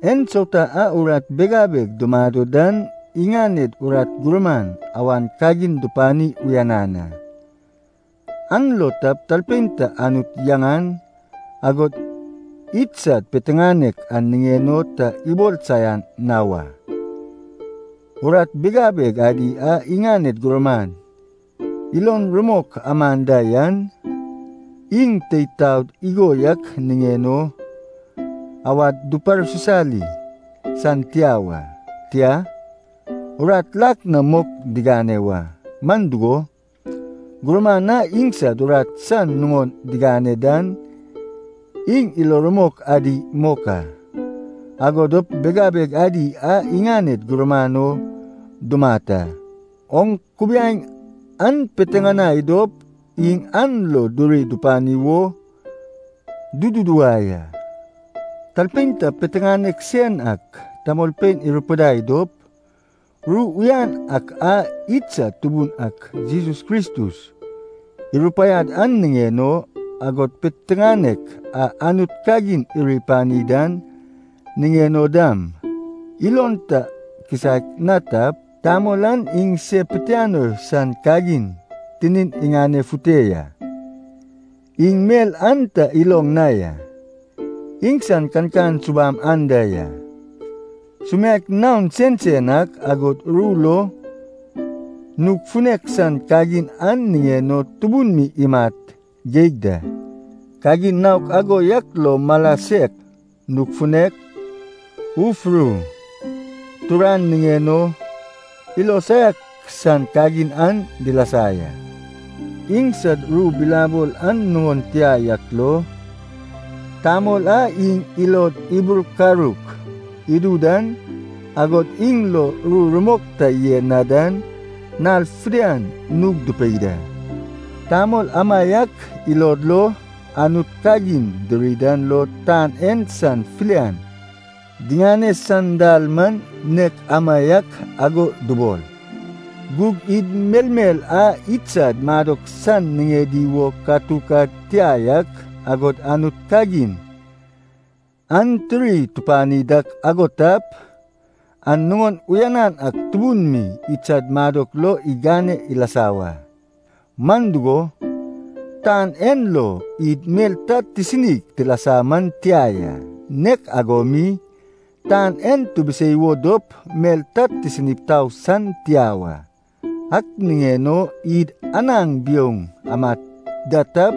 Ensauta a urat bigabeg dumado dan iŋaned urat gurman awan kagin dupani uyanan a. An lo talpein ta Anut yaŋan, agod idsad piteŋanek an niŋen o ta ibol saian na wa. Urat bigabeg adi a iŋaned gurman ilo rumok amad da yan, iŋ teid taod igo yak niŋen o awad duparsisali san tia wa. Tia, urat lak na mok digane wa. Man dugo, gurman a iŋsad urat san nuŋon diŋane dan iŋ ilo rumok adi mok a, ago dop bigabeg adi an iŋaned gurman o dumat a. Oŋ kubiaeŋ an piteŋanai dop iŋ an lo duri dupani wo duduwai a. Talpein ta piteŋanek sen ak tamolpein irupidai dop, ru uyan ak a idsad Tubun ak Jesus Kristus irupaiad an niŋen o, agod piteŋanek a Anut kagin iri pani dan niŋen o dam, ilon ta kisaek na tap, tamol an iŋ se pitianoi san kagin tinin iŋanefute ya. Iŋ mel ta iloŋ na ya. Iŋsan kankan subam anda ya, sumiaek naon sensen ak, agod ru lo nug funek san kagin an niŋen o tubun mi imat geig da. Kagin naok ago yak lo mala sek, nug funek, uf ru, turan niŋen o ilo saiak san kagin an dilasa ya. Iŋsad ru bilabol an nuŋon tia yak lo, tamol a iŋ ilod iburkaruk idu dan, agod iŋ lo ru rumok ta yen na dan, nal fidian nug dupei da. Tamol amaiak ilod lo, Anut kagin diri dan lo tan en san filian diŋane san dal man nek amaiak ago dubol. Gug id melmel a idsad madok san niŋedi wo katuk ad tia yak, agod Anut kagin an tiri tupani dak ago tap, an nuŋon uyanan ak tubun mi idsad madok lo igane ilasa wa. Man dugo, tan en lo id mel ta tisinig tilasa man tia ya. Nek ago mi, tan en tibisei wo dop mel ta tisinip tau san tia wa. Ak niŋen o, id anaŋ biouŋ amad da tap,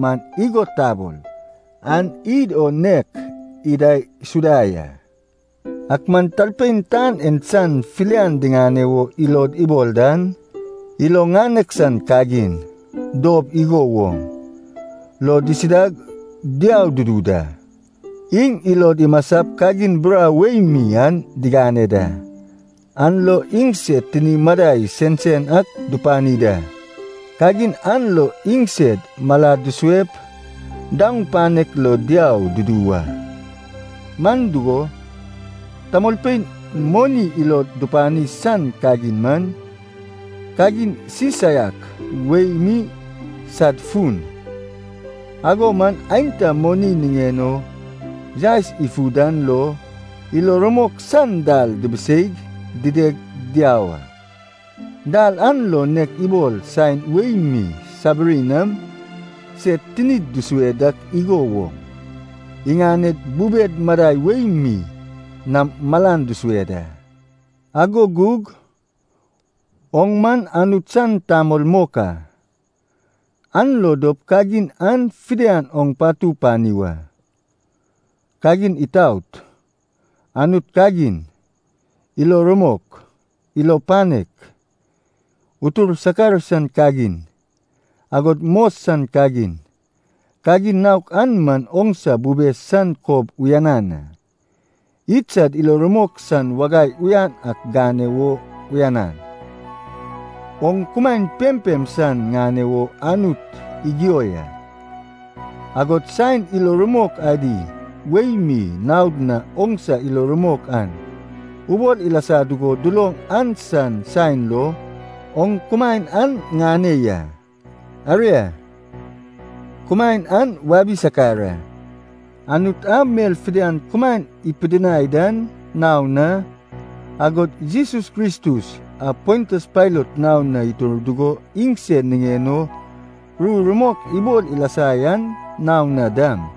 man igo tabol, an id o nek idaisuda ya. Ak man talpein tan en san filian diŋane wo ilod ibol dan, ilo ŋanek san kagin, dob igo woŋ, lo disidag diau dudu da. Iŋ ilod imasap kagin burau wei mi an digane da, an lo iŋsed tini madai sensen ak dupani da. Kagin an lo iŋsed malad dusuep daoŋ panek lo diau dudu wa. Man dugo, tamolpein moni ilod dupani san kagin man, kagin sisaiak wei mi sad fun. Ago man, aenta moni niŋen o yaes ifu dan lo ilo rumok san dal dibiseig dideg diau a. Dal an lo nek ibol saen wei mi sabiri nam sed tinid dusue dak igo woŋ, iŋaned bubed madai wei mi nam malan dusue da. Ago gug, oŋ man Anut san tamol mok a. An lo dop kagin an fidian oŋ patu pani wa. Kagin itaot, Anut kagin, ilo rumok, ilo panek, utur sakar san kagin, agod mos san kagin, kagin naok an man oŋsa bube san kob uyanan a. Idsad ilo rumok san wagai uyan ak gane wo uyanan. Oŋ kumaen pempem san ŋane wo Anut igio ya, agod saen ilo rumok adi wei mi naod na oŋsa ilo rumok an ubol ilasa dugo duloŋ an san saen lo, oŋ kumaen an ŋane ya. Aria, kumaen an wabi sakar a. Anut a mel fidian kumaen ipidinai dan naon na, agod Jesus Kristus a Pontius Pailat naon na itur dugo iŋsen niŋen o ru rumok ibol ilasa yan naon na dam,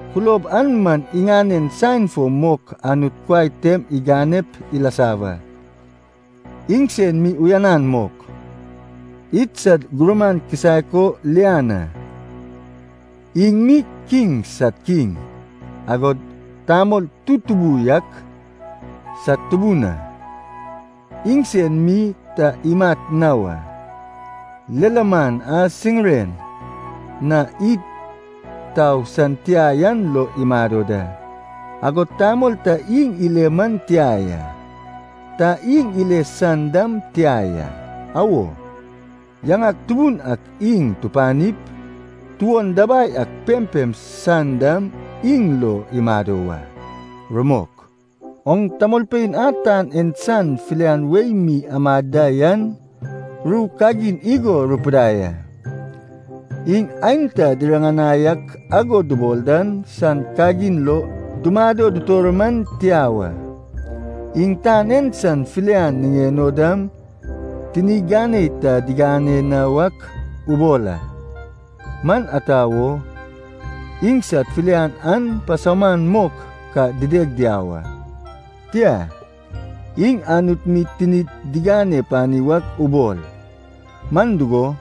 Kulob an man iŋanen saen fo mok Anut kuai tem iganep ilasa wa. Iŋsen mi uyanan mok, idsad Gurman kisaek o lian a. Iŋ mi kiŋ sad Kiŋ, agod tamol tutubu yak sad Tubun a. Iŋsen mi ta imat na wa, lilaman a siŋiren na id tau san tia yan lo imado da, agod tamol ta iŋ ile man tia ya, ta iŋ ile san dam tia ya. Awo, yaŋak tubun ak iŋ tupanip, tuon dabai ak pempem san dam iŋ lo imado wa. Rumok Oŋ tamolpein a tan en san filian wei mi amad da yan ru kagin igo rupidai a, iŋ aenta diriŋanai ak ago dubol dan san kagin lo dumado dutor man tia wa. Iŋ tan en san filian niŋen o dam tini ganei ta digane na wak ubol a, man ata wo, iŋsad filian an pasauman mok ka dideg diau a. Tia, iŋ Anut mi tinid digane pani wak ubol. Man dugo,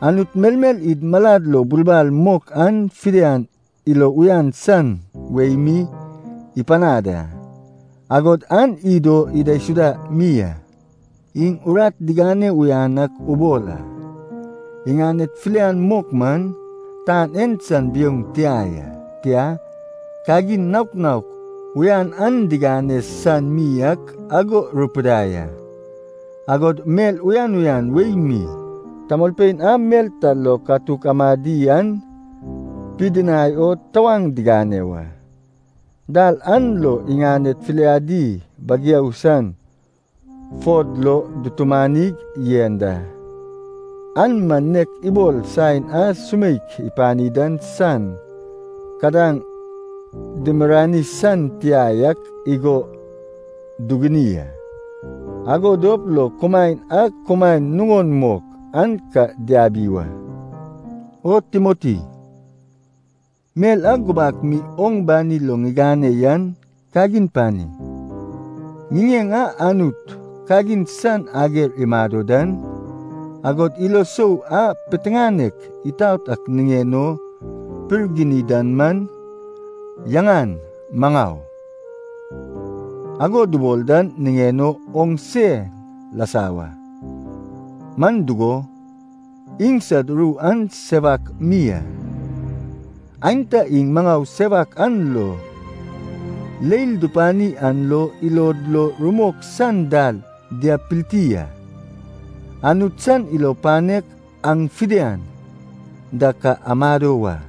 Anut melmel id malad lo bulbal mok an fidian ilo uyan san wei mi ipanad a, agod an id o idaisuda mi a. Iŋ urat digane uyan ak ubol a. Iŋaned filian mok man, tan en san biouŋ tia ya, tia, kagin naok naok uyan an digane san mi ak ago rupidai a, agod mel uyan uyan wei mi tamolpein a mel ta lo katuk amadi an dipidinai o tawaŋ digane wa. Dal an lo iŋaned filiadi bageu san fod lo dutumanig yen da. An man nek ibol saen a sumeik ipani dan san kadaŋ dimirirani san tia yak igo duguni a. Ago dop lo kumaen a kumaen nuŋon mok an ka diabi wa. O Timoti, mel a gubak mi oŋ bani lo ŋigane yan kagin pani. Ŋiŋeŋ a Anut kagin san ager imado dan, agod ilo sou a piteŋanek itaot ak niŋen o ipirgini dan man, yaŋan “maŋau” ago dubol dan niŋen o oŋ sen lasa wa, man dugo, iŋsad ru an sewak mi a. Aenta iŋ maŋau sewak a lo leil dupani an lo ilod lo rumok san dal diabpilti a. Anut san ilo panek aŋ fidian da ka amado wa.